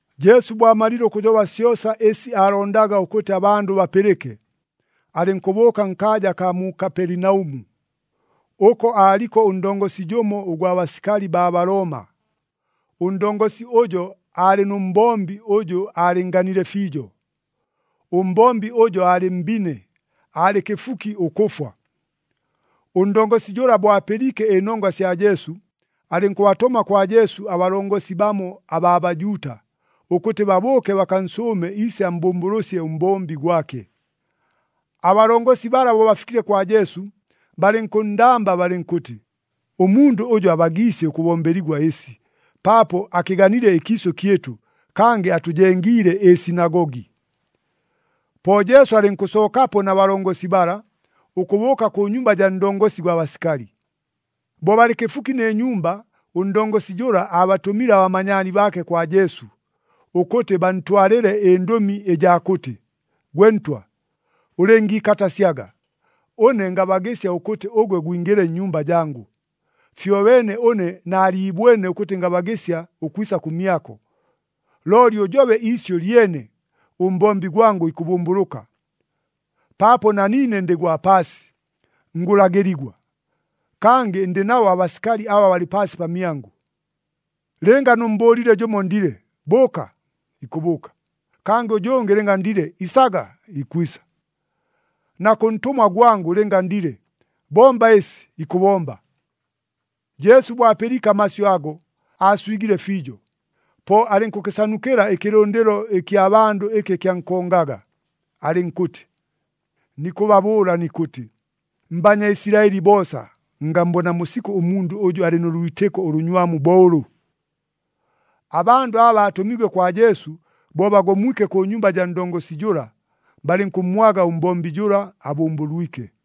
Jesu bo amalile ʉkʉjoba syosa ɨsi aalondaga ʉkʉtɨ abandʉ bapɨlɨke, alɨnkʉbʉʉka nkaaja akaa mu Kapelinaʉmu. Ʉko aaliko ʉndongosi jʉmo ʉgwa basikali baa Balooma. Ʉndongosi ʉjo aalɨ nʉ mbombi ʉjʉ aalɨnnganile fiijo. Ʉmbombi ʉjo aalɨ mbine, aalɨ kɨfuki ʉkʉfwa. Ʉndongosi jʉla bo apɨliike ɨnongwa sya Jesu, alɨnkʉbatʉma kwa Jesu abalongosi bamo abaa Bajuuta, ʉkʉtɨ babʉʉke bakansʉʉme iise ammbʉmbʉlʉsye ʉmbombi gwake. Abalongosi bala bo bafikile kwa Jesu, balɨnkʉnndamba balɨnkʉtɨ, “Ʉmundʉ ʉjʉ abagiisye ʉkʉbombeligwa ɨsi, paapo akɨganile ɨkiisʉ kyɨtʉ, kangɨ atʉjengiile ɨsinagogi.” Po Jesu alɨnkʉsookapo na balongosi bala, ʉkʉbʉʉka kʉ nyumba jaa ndongosi gwa basikali. Bo balɨ kɨfuki nɨ nyumba, ʉndongosi jʉla aabatʉmile abamanyaani baake kwa Jesu, ʉkʉtɨ bantwalɨle ɨndʉmi ɨjaa kʉtɨ, “Gwe Ntwa, ʉlɨngiikatasyaga, ʉne ngabagɨsya ʉkʉtɨ ʉgwe gwingɨle nnyumba jangʉ. Fyobeene ʉne naaliibwene ʉkʉtɨ, ngabagɨsya ʉkwisa kʉmyako. Looli ʉjobe iisyʉ lyene, ʉmbombi gwangʉ ikʉbʉmbʉlʉka. Paapo na niine ndɨ gwa paasi, ngʉlagɨligwa, kangɨ ndɨ nabo abasikali aba balɨ paasi pamyangʉ. Lɨnga nʉmmbʉʉlile jʉmo ndile, ‘Bʉʉka!’ ikʉbʉʉka. Kʉ jʉngɨ lɨnga ndile, ‘Isaga!’ ikwisa. Na kʉ ntʉmwa gwangʉ lɨnga ndile, ‘Bomba ɨsi!’ ikʉbomba.” Jesu bo apɨliike amasyʉ ago, aaswigile fiijo. Po alɨnkʉkɨsanukɨla ɨkɨlʉndɨlo ɨkya bandʉ ɨkɨ kyankongaga, alɨnkʉtɨ, “Nikʉbabʉʉla nikʉtɨ, mBanyaisilaɨli boosa, ngammbonamo sikʉ ʉmundʉ ʉjʉ alɨ nʉ lwitɨko ʉlʉnywamu bo ʉlʉ!” Abandʉ aba baatʉmiigwe kwa Jesu, bo bagomwike kʉ nyumba jaa ndongosi jʉla, balɨnkʉmmwaga ʉmbombi jʉla abʉmbʉlwike.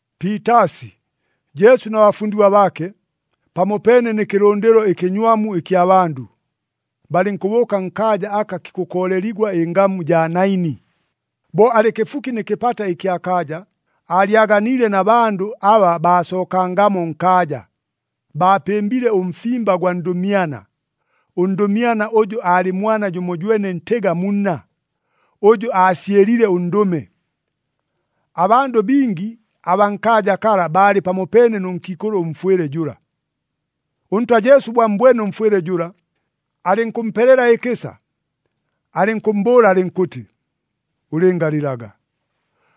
Piitaasi, Jesu na bafundigwa baake, pamopeene nɨ kɨlʉndɨlo ɨkɨnywamu ɨkya bandʉ, balɨnkʉbʉʉka nkaaja aka kikʉkooleligwa ɨngamu jaa Naini. Bo alɨ kɨfuki nɨ kɨpata ɨkya kaaja, aalyaganiile na bandʉ aba baasookangamo nkaaja, baapɨmbile ʉmfimba gwa ndʉmyana. Ʉndʉmyana ʉjʉ aalɨ mwana jʉmojwene ntɨga mu nna, ʉjʉ aasyɨlile ʉndʉme. Abandʉ bingi abaa nkaaja kala baalɨ pamopeene nʉ nkiikʉlʉ ʉmfwɨle jʉla. ɄNtwa Jesu bo ammbwene ʉmfwɨle jʉla, alɨnkʉmpelela ɨkɨsa. Alɨnkʉmmbʉʉla alɨnkʉtɨ, “Ʉlɨngalɨlaga.”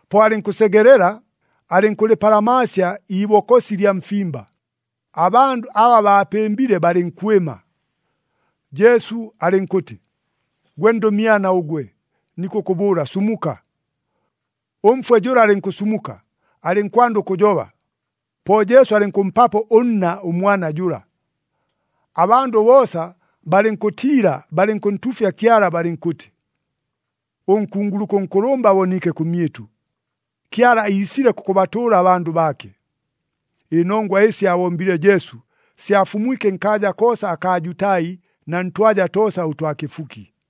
Po alɨnkʉsegelela, alɨnkʉlɨpalamaasya iibokosi lya mfimba, abandʉ aba baapɨmbile balɨnkwɨma. Jesu alɨnkʉtɨ, “Gwe ndʉmyana ʉgwe, nikʉkʉbʉʉla, sumuka!” Ʉmfwe jʉla alɨnkʉsumuka, alɨnkwanda ʉkʉjoba. Po Jesu alɨnkʉmpapo ʉnna ʉmwana jʉla. Abandʉ boosa balɨnkʉtiila, balɨnkʉntuufya Kyala balɨnkʉtɨ, “Ʉnkunguluka ʉnkʉlʉmba aboniike kʉmyɨtʉ! Kyala iisile kʉkʉbatʉʉla abandʉ baake!” Ɨnongwa ɨsi aabombile Jesu, syafumwike nkaaja koosa akaa Jutai na ntwaja toosa ʉtwa kɨfuki.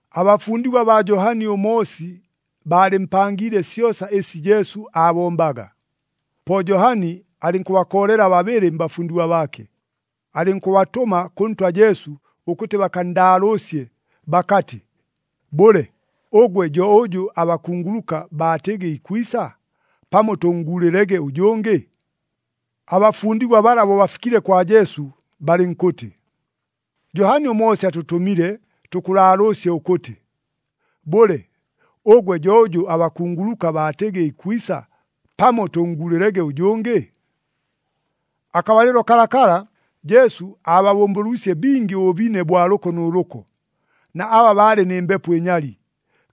Abafundigwa baa Johani ʉMoosi baalɨmpangiile syosa ɨsi Jesu aabombaga. Po Johani alɨnkʉbakoolela babɨlɨ mbafundigwa baake, alɨnkʉbatʉma kʉ Ntwa Jesu ʉkʉtɨ bakanndaalʉʉsye bakatɨ, “Bʉle, ʉgwe jo ʉjʉ abakunguluka baatɨgɨ ikwisa? Pamo tʉnnguulɨlege ʉjʉngɨ?” Abafundigwa bala bo bafikile kwa Jesu, balɨnkʉtɨ, “Johani ʉMoosi atʉtʉmile tʉkʉlaalʉʉsye ʉkʉtɨ, ‘Bʉle, ʉgwe jo ʉjʉ abakunguluka baatɨgɨ ikwisa? Pamo tʉnnguulɨlege ʉjʉngɨ?’” Akabalɨlo kalakala, Jesu aababʉmbʉlwisye bingi ʉbʉbine ʉbwa lʉko nʉ lʉko, na aba baalɨ nɨ mbepo ɨnyali,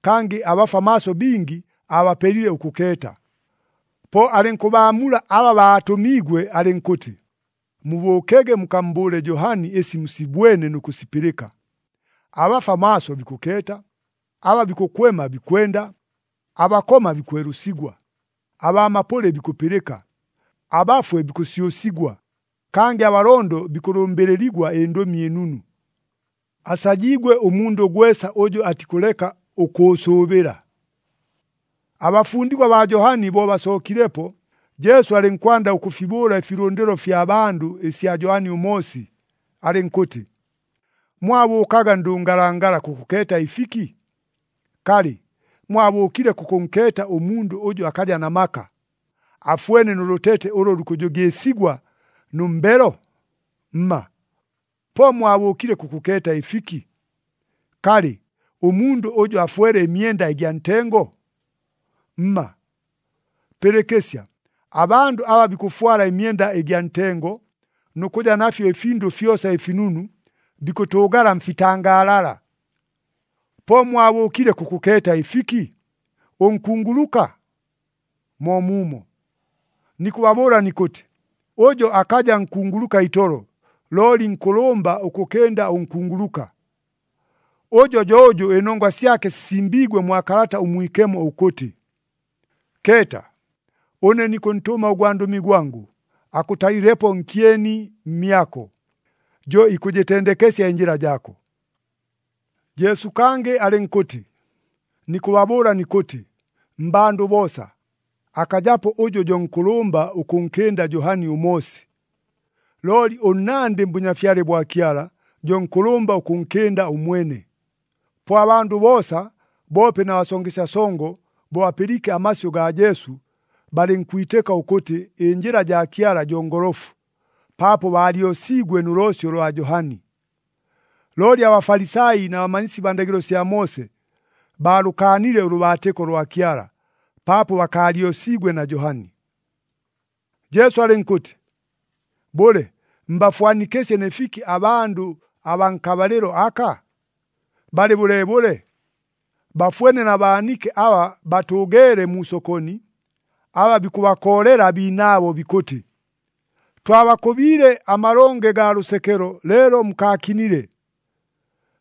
kangɨ abafwa maaso bingi aabapelile ʉkʉkeeta. Po alɨnkʉbaamula aba baatʉmiigwe alɨnkʉtɨ, “Mubʉʉkege mukammbʉʉle Johani ɨsi musibwene nʉ kʉsipɨlɨka. Abafwa maaso bikʉkeeta, aba bikʉkwema bikwenda, abakoma bikwelʉsigwa, abaa mapʉlɨ bikʉpɨlɨka, abafwe bikʉsyʉsigwa, kangɨ abalondo bikʉlʉmbɨlɨligwa ɨNdʉmi ɨNunu. Asajiigwe ʉmundʉ gwesa ʉjʉ atikʉleka ʉkʉʉsʉʉbɨla.” Abafundigwa baa Johani bo basookilepo, Jesu alɨnkwanda ʉkʉfibʉʉla ɨfilʉndɨlo ɨfya bandʉ ɨsya Johani ʉMoosi, alɨnkʉtɨ, “Mwabʉʉkaga ndʉngalangala kʉkʉkeeta ɨfiki? Kalɨ, mwabʉʉkile kʉkʉnkeeta ʉmundʉ ʉjʉ akaja na maka, afwene nʉ lʉtete ʉlʉ lukʉjʉgɨɨsigwa nʉ mbelo? Mma! Po mwabʉʉkile kʉkʉkeeta ɨfiki? Kalɨ, ʉmundʉ ʉjʉ afwele ɨmyenda ɨgya ntengo? Mma! Pɨlɨkɨsya! Abandʉ aba bikʉfwala ɨmyenda ɨgya ntengo, nʉ kʉja nafyo ɨfindʉ fyosa ɨfinunu, bikʉtʉʉgala mfitangaalala. Po mwabʉʉkile kʉkʉkeeta ɨfiki? Ʉnkunguluka? Moomuumo! Nikʉbabʉʉla nikʉtɨ, ʉjo akaja nkunguluka itolo, looli nkʉlʉmba ʉkʉkɨnda ʉnkunguluka. Ʉjo jo ʉjʉ ɨnongwa syake sisimbiigwe mwa Kalata ʉMwikemo, ʉkʉtɨ, ‘Keeta, ʉne nikʉntʉma ʉgwandʉmi gwangʉ, akʉtalɨlepo nkyeni mmyako, jo ikʉjɨtendekesya ɨnjɨla jaako.’” Jesu kangɨ alɨnkʉtɨ, “Nikʉbabʉʉla nikʉtɨ, mmbandʉ boosa, akajapo ʉjʉ jo nkʉlʉmba ʉkʉnkɨnda Johani ʉMoosi. Looli ʉnnandɨ mBʉnyafyale bwa Kyala, jo nkʉlʉmba ʉkʉnkɨnda ʉmwene.” Po abandʉ boosa, boope na basongesya songo, bo bapɨliike amasyʉ gaa Jesu, balɨnkwitɨka ʉkʉtɨ ɨnjɨla jaa Kyala jo ngolofu, paapo baalyosiigwe nʉ loosyo lwa Johani. Looli aBafalisai na bamanyisi baa ndagɨlo sya Moose, baalʉkaanile ʉlʉbaatɨko lwa Kyala, paapo bakaalyosiigwe na Johani. Jesu alɨnkʉtɨ, “Bʉle, mbafwanikɨsye nɨ fiki abandʉ abaa nkabalɨlo aka? Balɨ bʉleebʉle? Bafwene na baanike aba batʉʉgeele mu sokoni, aba bikʉbakoolela abiinaabo bikʉtɨ, ‘Twabakʉbiile amalonge gaa lʉsekelo, leelo mukaakinile!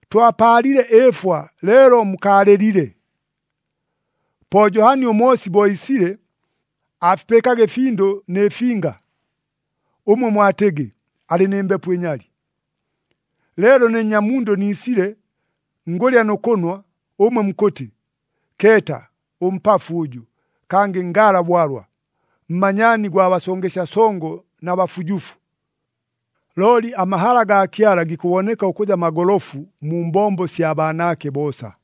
Twapaalile ɨɨfwa, leelo mukaalɨlile!’ “Po Johani ʉMoosi bo iisile, aafipɨɨkaga ɨfindʉ nɨ finga, ʉmwe mwatɨgɨ, ‘Alɨ nɨ mbepo ɨnyali.’ Leelo ne Nnyamundʉ niisile, ngʉlya nʉ kʉnwa, ʉmwe mukʉtɨ, ‘Keeta! Ʉmpafu ʉjʉ, kangɨ ngaala bwalwa! Mmanyaani gwa basongesya songo na bafujufu!’ Looli amahala gaa Kyala gikʉboneka ʉkʉja magolofu mu mbombo sya baanaake boosa.”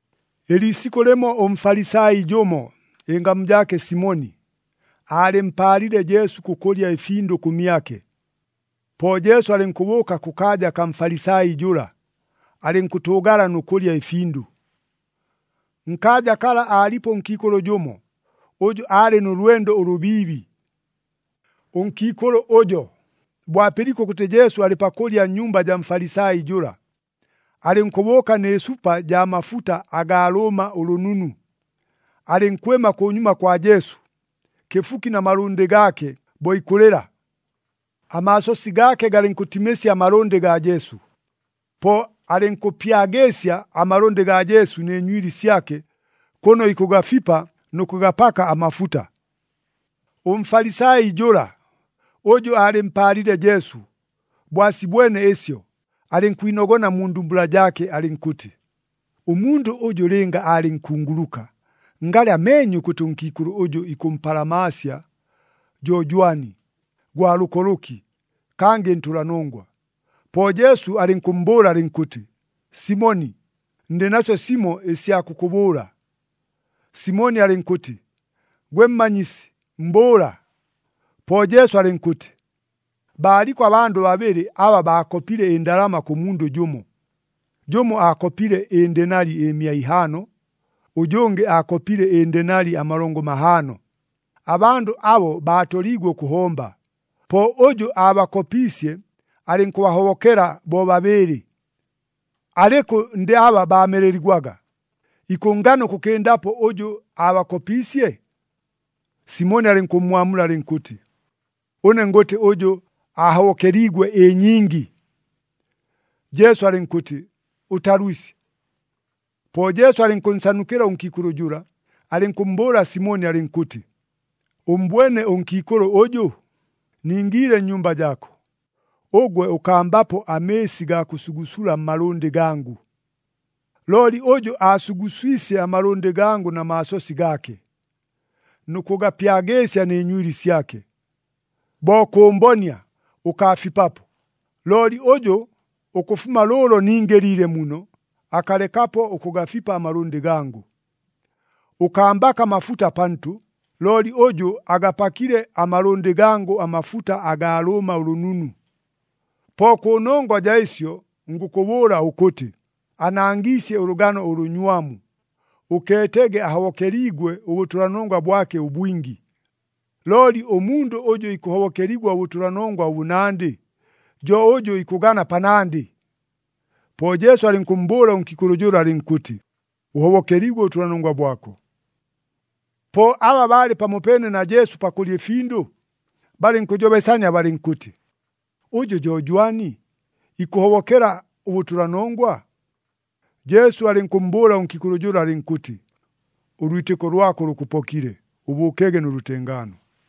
Ɨliisikʉ lɨmo ʉMfalisai jʉmo, ɨngamu jaake Simoni, aalɨmpaalile Jesu kʉkʉlya ɨfindʉ kʉmyake. Po Jesu alɨnkʉbʉʉka kʉkaaja kaa Mfalisai jʉla, alɨnkʉtʉʉgala nʉ kʉlya ɨfindʉ. Nkaaja kala aalipo ʉnkiikʉlʉ jʉmo, ʉjʉ aalɨ nʉ lwendo ʉlʉbiibi. Ʉnkiikʉlʉ ʉjo, bo apɨliike ʉkʉtɨ Jesu alɨ pakʉlya nnyumba jaa Mfalisai jʉla, alɨnkʉbʉʉka nɨ supa jaa mafuta agaa lʉʉma ʉlʉnunu. Alɨnkwɨma kʉnyuma kwa Jesu, kɨfuki na malʉndɨ gaake bo ikʉlɨla. Amaasosi gaake galɨnkʉtimɨsya amalʉndɨ gaa Jesu. Po alɨnkʉpyagɨɨsya amalʉndɨ gaa Jesu nɨ nywili syake, kʉno ikʉgafipa nʉ kʉgapaka amafuta. ɄMfalisai jʉla, ʉjʉ aalɨmpaalile Jesu, bo asibwene ɨsyo, alɨnkwinogona mu ndumbula jaake alɨnkʉtɨ, “Ʉmundʉ ʉjʉ lɨnga aalɨ nkunguluka, ngalɨ ameenye ʉkʉtɨ ʉnkiikʉlʉ ʉjʉ ikʉmpalamaasya jo jwani, gwa lʉko lʉki, kangɨ ntʉlanongwa.” Po Jesu alɨnkʉmmbʉʉla alɨnkʉtɨ, “Simoni, ndɨ nasyo simo ɨsya kʉkʉbʉʉla.” Simoni alɨnkʉtɨ, “Gwe Mmanyisi, mbʉʉla.” Po Jesu alɨnkʉtɨ, “Baaliko abandʉ babɨlɨ aba baakopile ɨndalama kʉ mundʉ jʉmo. Jʉmo aakopile ɨndenali ɨmia ihaano, ʉjʉngɨ aakopile ɨndenali amalongo mahaano. Abandʉ abo baatoliigwe ʉkʉhomba, po ʉjʉ aabakopiisye alɨnkʉbahobokela bobabɨɨlɨ. Alɨkʉ ndɨ aba baameleligwaga, ikʉnngana ʉkʉkɨndapo ʉjʉ aabakopiisye?” Simoni alɨnkʉmmwamula alɨnkʉtɨ, “Ʉne ngʉtɨ, ʉjʉ aahobokeliigwe ɨnyingi.” Jesu alɨnkʉtɨ, “Ʉtalwisye.” Po Jesu alɨnkʉnsanukɨla ʉnkiikʉlʉ jʉla, alɨnkʉmmbʉʉla Simoni alɨnkʉtɨ, “Ʉmmbwene ʉnkiikʉlʉ ʉjʉ? Ningiile nnyumba jaako, ʉgwe ʉkambapo amɨɨsi gaa kʉsugusula mmalʉndɨ gangʉ. Looli ʉjʉ, aasuguswisye amalʉndɨ gangʉ na maasosi gaake, nʉ kʉgapyagɨɨsya nɨ nywili syake. Bo kʉmbonia, ʉkaafipapo. Looli ʉjʉ, ʉkʉfuma lʉʉlo ningɨliile muno, akalekapo ʉkʉgafipa amalʉndɨ gangʉ. Ʉkambaka amafuta pantʉ, looli ʉjʉ agapakile amalʉndɨ gangʉ amafuta agaa lʉʉma ʉlʉnunu. Po kʉnongwa jaa ɨsyo ngʉkʉbʉʉla ʉkʉtɨ, anangiisye ʉlʉgano ʉlʉnywamu, ʉkeetege ahobokeliigwe ʉbʉtʉlanongwa bwake ʉbwingi. Looli ʉmundʉ ʉjʉ ikʉhobokeligwa ʉbʉtʉlanongwa ʉbʉnandɨ, jo ʉjʉ ikʉgana panandɨ.” Po Jesu alɨnkʉmmbʉʉla ʉnkiikʉlʉ jʉla alɨnkʉtɨ, “Ʉhobokeliigwe ʉbʉtʉlanongwa bwako.” Po aba baalɨ pamopeene na Jesu pakʉlya ɨfindʉ, balɨnkʉjobesania balɨnkʉtɨ, “Ʉjʉ jo jwani, ikʉhobokela ʉbʉtʉlanongwa?” Jesu alɨnkʉmmbʉʉla ʉnkiikʉlʉ jʉla alɨnkʉtɨ, “Ʉlwitɨko lwako lʉkʉpokile. Ʉbʉʉkege nʉ lʉtengaano!”